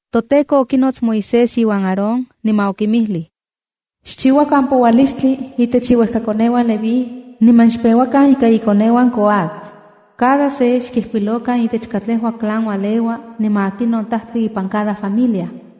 ToTEKO okinots Moisés iuan Aarón, niman okinmijlij: “Xchiuakan poualistli itech iuejkakoneuan Leví niman xpeuakan ika ikoneuan Coat. Cada se xkijkuilokan itech katlejua clan ualeua niman akinon tajtli ipan cada familia.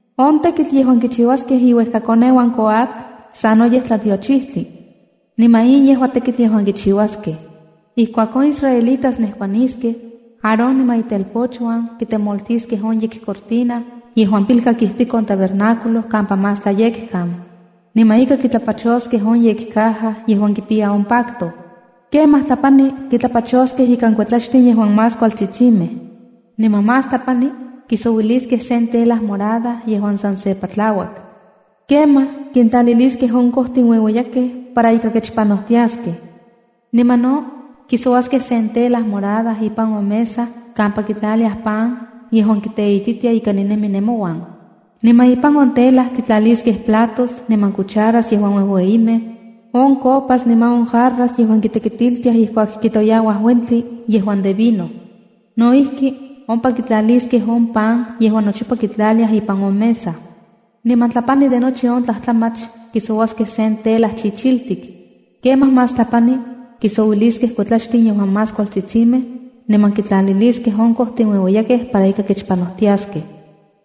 ’On tekitl yejuan kichiuaskej iuejkakoneuan Coat sanoyej tlatiochijtli. Niman in yejua on tekitl yejuan kichiuaskej: Ijkuak on israelitas nejkuaniskej, Aarón niman itelpochuan kitemoltiskej on yekcortina yejuan pilkak ijtik on tabernáculo kampa Más Tlayekkan, niman ika kitlapachoskej on yekcaja yejuan kipiya on pacto. Kemaj tlapani kitlapachoskej ikan kuetlaxtin yejuan más kualtsitsimej. Niman más tlapani kisouiliskej sen tela morada yejuan san se patlauak. Kemaj kintlaliliskej on kojtin ueueyakej para ika kechpanojtiaskej. ’Niman no kisouaskej sen tela morada ipan on mesa kampa kitlaliaj pan yejuan kiteititia ika ninemi nemouan. Niman ipan on tela kintlaliskej platos, niman cucharas yejuan uejueyimej, on copas niman on jarras yejuan kitekitiltiaj ijkuak kitoyauaj uentli yejuan de vino. No ijki, ompa kitlaliskej on pan yejuan nochipa kitlaliaj ipan on mesa. Niman tlapani de nochi on tlajtlamach, kisouaskej sen tela chichiltik. Kemaj más tlapani kisouiliskej kuetlaxtin yejuan más kualtsitsimej, niman kintlaliliskej on kojtin ueueyakej para ika kechpanojtiaskej.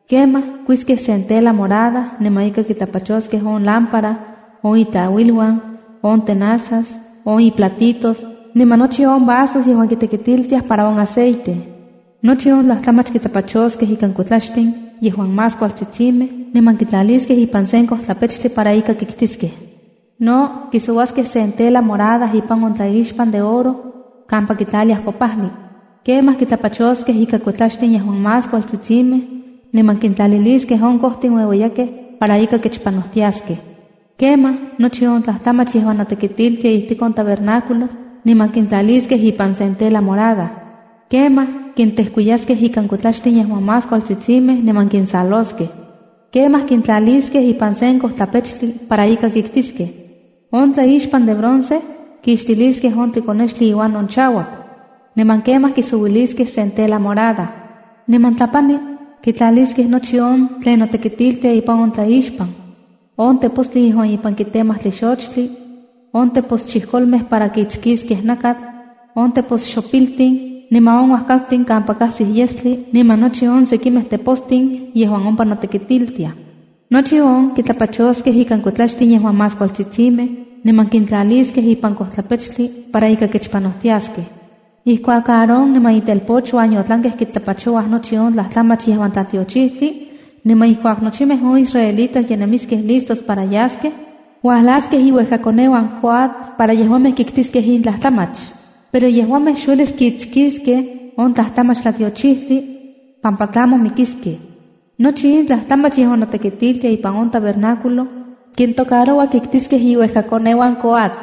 ’Kemaj kuiskej sen tela morada niman ika kitlapachoskej on lámpara, on itlauiluan, on tepostlakitskijli, on iplatitos, niman nochi on vasos yejuan kintekitiltiaj para on aceite. Nochi on tlajtlamach kitlapachoskej ikan kuetlaxtin yejuan más kualtsitsimej niman kitlaliskej ipan sen kojtlapechtli para ika kiktiskej ’No kisouaskej sen tela morada ipan on tlaixpan de oro kampa kitlatiaj kopajli. Kemaj kitlapachoskej ika kuetlaxtin yejuan más kualtsitsimej niman kintlaliliskej on kojtin ueueyakej para ika kechpanojtiaskej. Kemaj, nochi on tlajtlamach yejuan notekitiltia ijtik on tabernáculo kinsentlaliskej niman kintlaliskej ipan sen tela morada. Kemaj kintejkuiyaskej ikan kuetlaxtin yejuan más kualtsitsimej niman kinsaloskej. Kemaj kintlaliskej ipan sen kojtlapechtli para ika kiktiskej. ’On tlaixpan yejuan de bronce, kixtiliskej on tlikonextli iuan on chauak. Niman kemaj kisouiliskej sen tela morada. Niman tlapani kitlaliskej nochi on tlen notekitiltia ipan on tlaixpan, on tepostli yejuan ipan kitemaj tlixochtli, on teposchijkolmej para kitskiskej nakatl, on teposxopiltin, niman on uajkaltin kampa kajsij yestli, niman nochi on sekimej tepostin yejuan ompa notekitiltiaj. Nochi on kitlapachoskej ikan kuetlaxtin yejuan más kualtsitsimej, niman kintlaliskej ipan kojtlapechtli para ika kechpanojtiaskej. Ijkuak Aarón niman itelpochuan yotlankej kitlapachouaj nochi on tlajtlamach yejuan tlatiochijtli, niman ijkuak nochimej on israelitas ye nemiskej listos para yaskej, uajlaskej iuejkakoneuan Coat para yejuamej kiktiskej in tlajtlamach. Pero yejuamej xuelis kitskiskej on tlajtlamach tlatiochijtli, pampa tlamo mikiskej. Nochi in tlajtlamach yejuan notekitiltia ipan on tabernáculo, kintocaroua kiktiskej iuejkakoneuan Coat. ’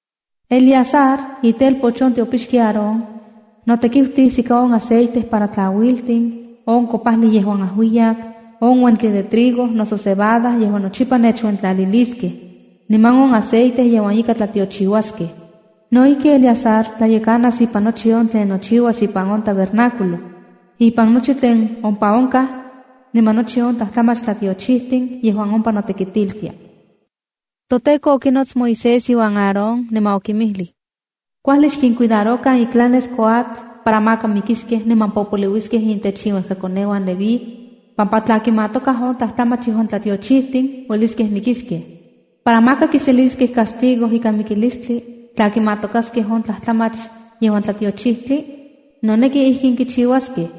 Eleazar, itelpoch on tiopixki Aarón, notekiutis ika on aceite para tlauiltin, on kopajli yejuan ajuiyak, on uentli de trigo noso cebada yejuan nochipa nechuentlaliliskej, niman on aceite yejuan ika tlatiochiuaskej. No ijkij Eleazar tlayekanas ipan nochi on tlen nochiuas ipan on tabernáculo, ipan nochi tlen ompa onkaj niman nochi on tlajtlamach tlatiochijtin yejuan ompa notekitiltia.” ToTEKO okinots Moisés iuan Aarón, niman okinmijlij: “Kuajli xkincuidarokan iclanes Coat para maka mikiskej niman popoliuiskej intech iuejkakoneuan Leví pampa tla kimatokaj on tlajtlamach yejuan tlatiochijtin uelis mikiskej. Para maka kiseliskej castigo ikan mikilistli tla kimatokaskej on tlajtlamach yejuan tlatiochijtli, noneki ijkin kichiuaskej: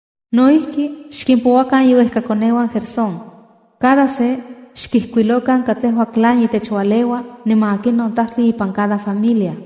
“No ijki, xkimpouakan iuejkakoneuan Gersón. Cada se xkijkuilokan katlejua clan itech ualeua niman akinon tajtli ipan cada familia.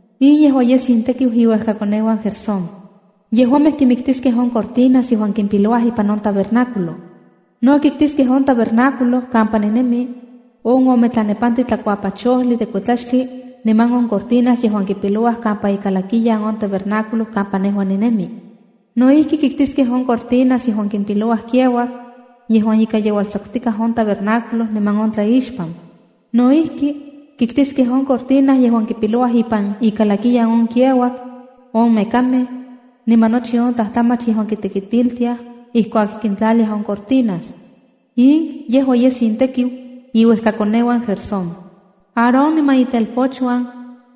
’In yejua yes intekiu iuejkakoneuan Gersón: Yejuamej kimiktiskej on cortinas yejuan kimpilouaj ipan on tabernáculo. No kiktiskej on tabernáculo kampa ninemi, on ome tlanepantli tlakuapachojli de kuetlaxtli niman on cortinas yejuan kipilouaj kampa ikalakiyan on tabernáculo kampa nejua ninemi. No ijki, kiktiskej on cortinas yejuan kimpilouaj kiauak, yejuan ika yeualtsakutikaj on tabernáculo niman on tlaixpan. No ijki, kiktiskej on cortina yejuan kipilouaj ipan ikalakiyan on kiauak, on mekamej, niman nochi on tlajtlamach yejuan kitekitiltiaj ijkuak kintlaliaj on cortinas. In yejua yes intekiu iuejkakoneuan Gersón. Aarón niman itelpochuan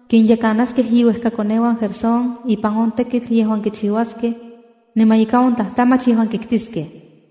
kinyekanaskej iuejkakoneuan Gersón ipan on tekitl yejuan kichiuaskej niman ika on tlajtlamach yejuan kiktiskej.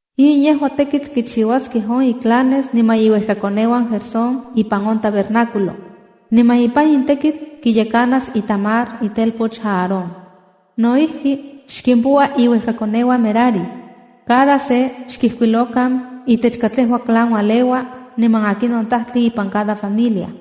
’In yejua tekitl kichiuaskej on iclanes niman iuejkakoneuan Gersón ipan on tabernáculo, niman ipan in tekitl kiyekanas Itamar itelpoch Aarón. ’No ijki, xkimpoua iuejkakoneuan Merari. Cada se xkijkuilokan itech katlekua clan ualeua niman akinon tajtli ipan cada familia.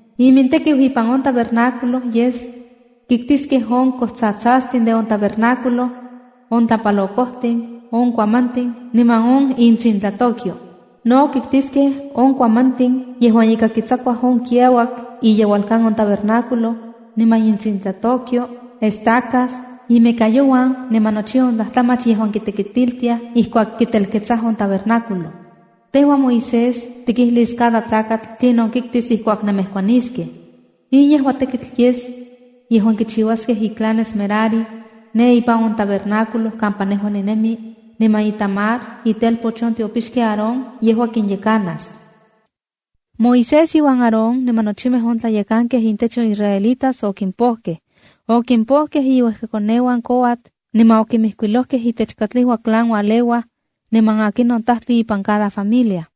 Imintekiu ipan on tabernáculo yes: Kiktiskej on kojtsatsastin de on tabernáculo, on tlapalokojtin, on kuamantin niman intsintlatokyo. No kiktiskej on kuamantin yejuan ika kitsakuaj on kiauak iyeualkan on tabernáculo niman intsintlatokyo, estacas, inmekayouan niman nochi on tlajtlamach yejuan kitekitiltiaj ijkuak kitelketsaj on tabernáculo. Tejua Moisés tikijlis cada tlakatl tlinon kiktis ijkuak nemejkuaniskej. In yejua tekitl yes yejuan kichiuaskej iclanes Merari ne ipan on tabernáculo kampa nejua ninemi, niman Itamar, itelpoch on tiopixki Aarón, yejua kinyekanas.” Moisés iuan Aarón niman nochimej on tlayekankej intech on israelitas okimpojkej. Okimpojkej inuejkakoneuan Coat niman okimijkuilojkej itech katlejua clan ualeuaj niman akinon tajtli ipan cada familia.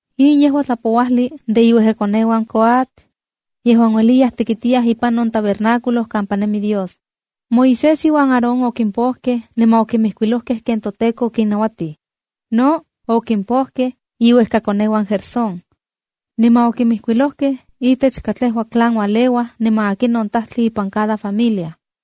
In yejua tlapouajli de iuejkakoneuan Coat yejuan ueliyaj tekitiyaj ipan on tabernáculo kampa nemi Dios. Moisés iuan Aarón okimpojkej niman okinmijkuilojkej ken toTEKO okinnauatij. No okimpojkej iuejkakoneuan Gersón, niman okimijkuilojkej itech katlejua clan ualeuaj niman akinon tajtli ipan cada familia.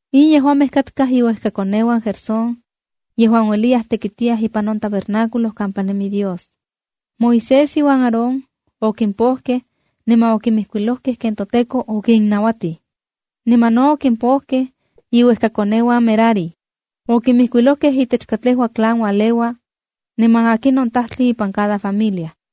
In yejuamej katkaj iuejkakoneuan Gersón yejuan ueliyaj tekitiyaj ipan on tabernáculo kampa nemi Dios. Moisés iuan Aarón okimpojkej niman okimijkuilojkej ken toTEKO okinnauatij. Niman no okimpojkej iuejkakoneuan Merari. Okinmijkuilojkej itech katlejua clan ualeua niman akinon tajtli ipan cada familia.